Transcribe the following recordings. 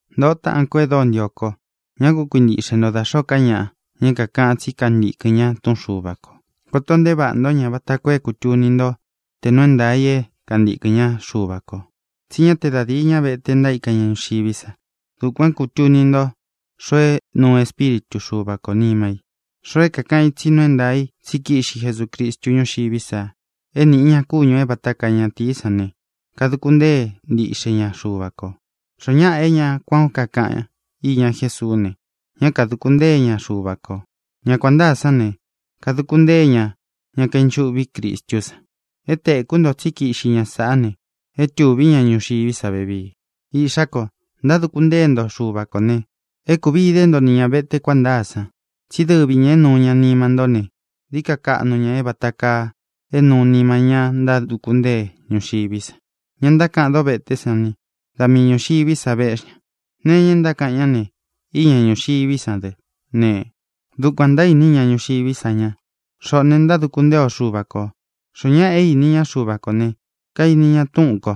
Ntōꞌo táꞌān kó e dóo ntio ko, ñá ku kuintiꞌxe nto da xōó ka ñaꞌa, ña é kākaꞌan tsí kantīkɨn ña túꞌun Xuva kō. Koto nteé vaꞌā ntó ña vata koo é kūtuni ntó tē nuu é ntaā i é kantīkɨn ñá Xuva kō. Tsí ña te da díi ñá vete ntaíka ña ñuxiví sa. Dukuān é kūtuni nto xoo é nūu Espíritu Xuva kō nima i: xoo é kākaꞌan i tsí nuu é ntaā í tsi kíꞌxi Jesucristu ñúxiví sa é nīꞌi ña kúñū é vata kaa ñatīí san ne, kaduku ntée ntiꞌxe ña Xuva kō. Xoó ñaꞌa é ña kuān ó kakaꞌan iña Jésuú ne, ñá kadūku ntée ña Xuva kō. Ña kuan ntāá san ne, kaduku ntée ña ña kainchuꞌví Cristú san. É tēkú nto tsí kiꞌxi ña saꞌá ne, é tuví ña ñuxiví sa vevii. Iꞌxá ko, ntáduku ntée nto Xuva kō ne, é kūvi ide ntó ni ña vete kuān ntáa san. Tsí dɨvi ñā é nūu ña nima ntó ne, dií ka kaꞌnu ña é vāta kaa é nūu nima ñá ntáduku ntée ñuxiví sa. Ña ntákaꞌan dóveté san ne, da mii ñūxiví sa véꞌxi ña. Nee iña e ntákaꞌan ñá ne, iña ñúxiví sa dɨ ne, dukuān ntaíni ña ñuxiví sa ña. Xoꞌō ne, ntáduku ntée o Xúva ko. Xoó ñaꞌa é īni ña Xúva kō ne, kaini ña túꞌun kō.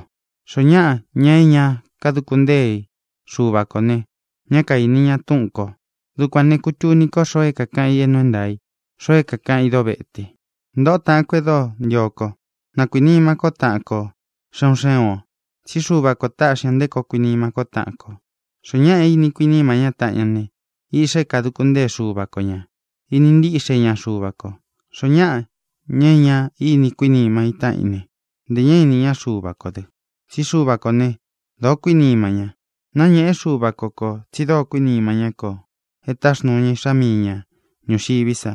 Xoó ñaꞌa, ña é ña kaduku ntée Xuva kō ne, ñá kaīni ña túꞌun kō. Dukuān ne, kutuni ko xoó kakaꞌan i é nuu é ntaā i, xoo é kākaꞌan í dovete. Ntōꞌo táꞌān ko e dóo ntio kó, na kuīnima kó taꞌan kō xé un xé un ō. Tsí Xuva kō táꞌxi ña nté koo kuinima kó taꞌan kō. Xoó ñaꞌa é ini kuiníma ñá taꞌan ña ne, iꞌxa é kāduku ntée Xuva ko ñā. Ini ntiꞌxe ñá Xuva kō. Xoó ñaꞌa, ña é ña íni kuinima í taꞌan í ne, ntē ñá īni ñá Xuva kō dɨ. Tsí Xuva kō ne, dóo kuínima ña. Náñēꞌe Xúva ko kō tsi dóo kuínima ñá kō e táxnūu ña Iꞌxá mii ña ñūxiví sa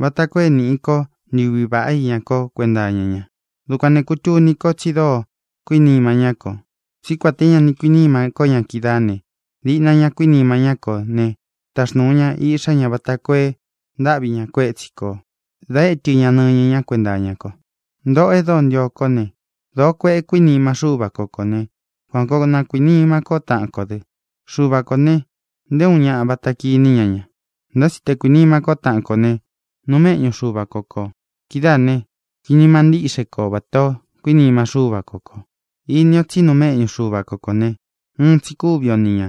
vata koo é nīꞌi ko ntuví vaꞌá iña ko kuenta iña ña. Dukuān né, kūtuni ko tsi dóo kuínima ñá kō, tsí kuān té ña ni kuiníma ko ña kídaā ne, diꞌna ña kuínima ñá kō ne, taxnūu ña Iꞌxá ña vata koo e ntáꞌvi ña kuétsi kō da étɨ ña nɨñɨ ña kuénta iña ko. Ntōꞌo e dóo ntio kó ne, dōó kueꞌe kuínima Xúva ko kō ne, kuan koo na kuīnima kó taꞌan kō dɨ. Xuva kō ne, nté uun ñaꞌa vata kiní ña ña. Ntá tsi te kuīnima kó taꞌan kō ne, nuu méꞌñu Xuva ko kō. Kidáā ne, kuinima ntíꞌxe ko vatā ó kuinima Xúva ko kō. Ini o tsí nuu méꞌñu Xuva ko kō ne, uun tsi kúvi o ni ñā,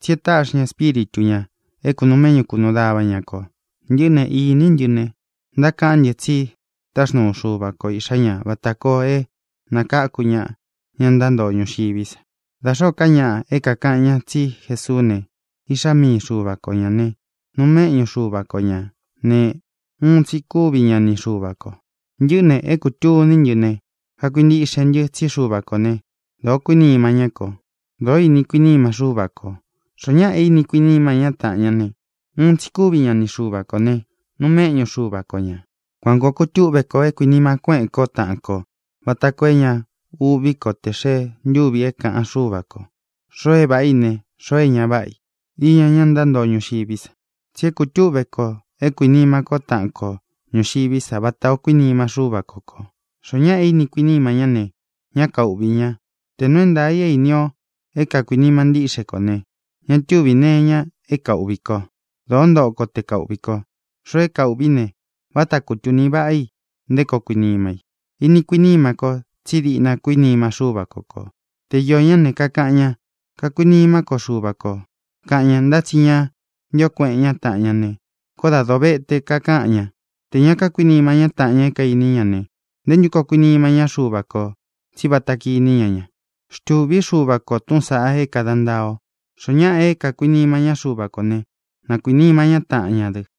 tsí e táꞌxi ña Espíritu ñā é kūnuu méꞌñu kunuu dava ña kō. Ntɨꞌɨ́ ne, iní ntɨ ne, ntákaꞌán ntɨ tsi táxnuu Xuva ko Iꞌxā ñá vata koo é nakáku ña ña ntántoo ñuxiví sa. Da xōó ka ñaꞌa é kākaꞌan ña tsí Jesuú ne, Iꞌxá mii Xuva ko ñā ne, nuu méꞌñu Xuva ko ñā ne, uun tsi kúvi ña ni Xuva kō. Ntɨꞌɨ́ ne, é kūtuní ntɨ ne, kakuintiꞌxe ntɨ tsí Xuva kō né, dōo kuínima ñá kō. Dōó ini kuiníma Xúva kō. Xoó ñaꞌa é ini kuiníma ñá taꞌan ñá ne, uun tsi kúvi ña ni Xuva kō ne, nuu méꞌñu Xuva ko ñā. Kuān koo kutúꞌve kō é kuinima kuéꞌen ko taꞌan kō vata koo é ña uꞌví ko tē xee ntúvi é kāꞌan Xúva ko xoo é vāꞌa í ne, xoo é ña váꞌa i iña ñá ntántoo ñuxiví sa. Tsi é kutúꞌve kō é kuīnima ko taꞌan ko ñuxiví sa vata ō kuínima Xúva ko kō. Xoó ñaꞌa é ini kuiníma ñá ne, ñá kauꞌvī ña. Tē nuu é ntaā i é īni o é kākuinima ntíꞌxe kō ne, ña túvī nee iña é kauꞌvi ko. Dōó ntoꞌo ko te kauꞌvī ko. Xoo é kauꞌvī í ne, váta kutūni váꞌa i nté koo kuinima i. Ini kuiníma kō, tsí diꞌna kuínima Xúva ko kō. Te iō ñá ne, kakaꞌan ña: “Kakuinimá ko Xuva kō”, kaꞌan ña, ntá tsi ña ntío kueꞌen ñá taꞌan ña ne, koó dā dovete kakaꞌan ña. Tē ña kákuinima ñá taꞌan ña é kainí ña ne, ¿nté ntu koo kuinima ñá Xuva kō, tsí vata kiní ña ña? Xtūví Xuva ko tūꞌun sáꞌā é kāda ntaa o: Xoó ñaꞌa é kākuinima ñá Xuva kō ne, na kuīnima ñá taꞌan ña dɨ.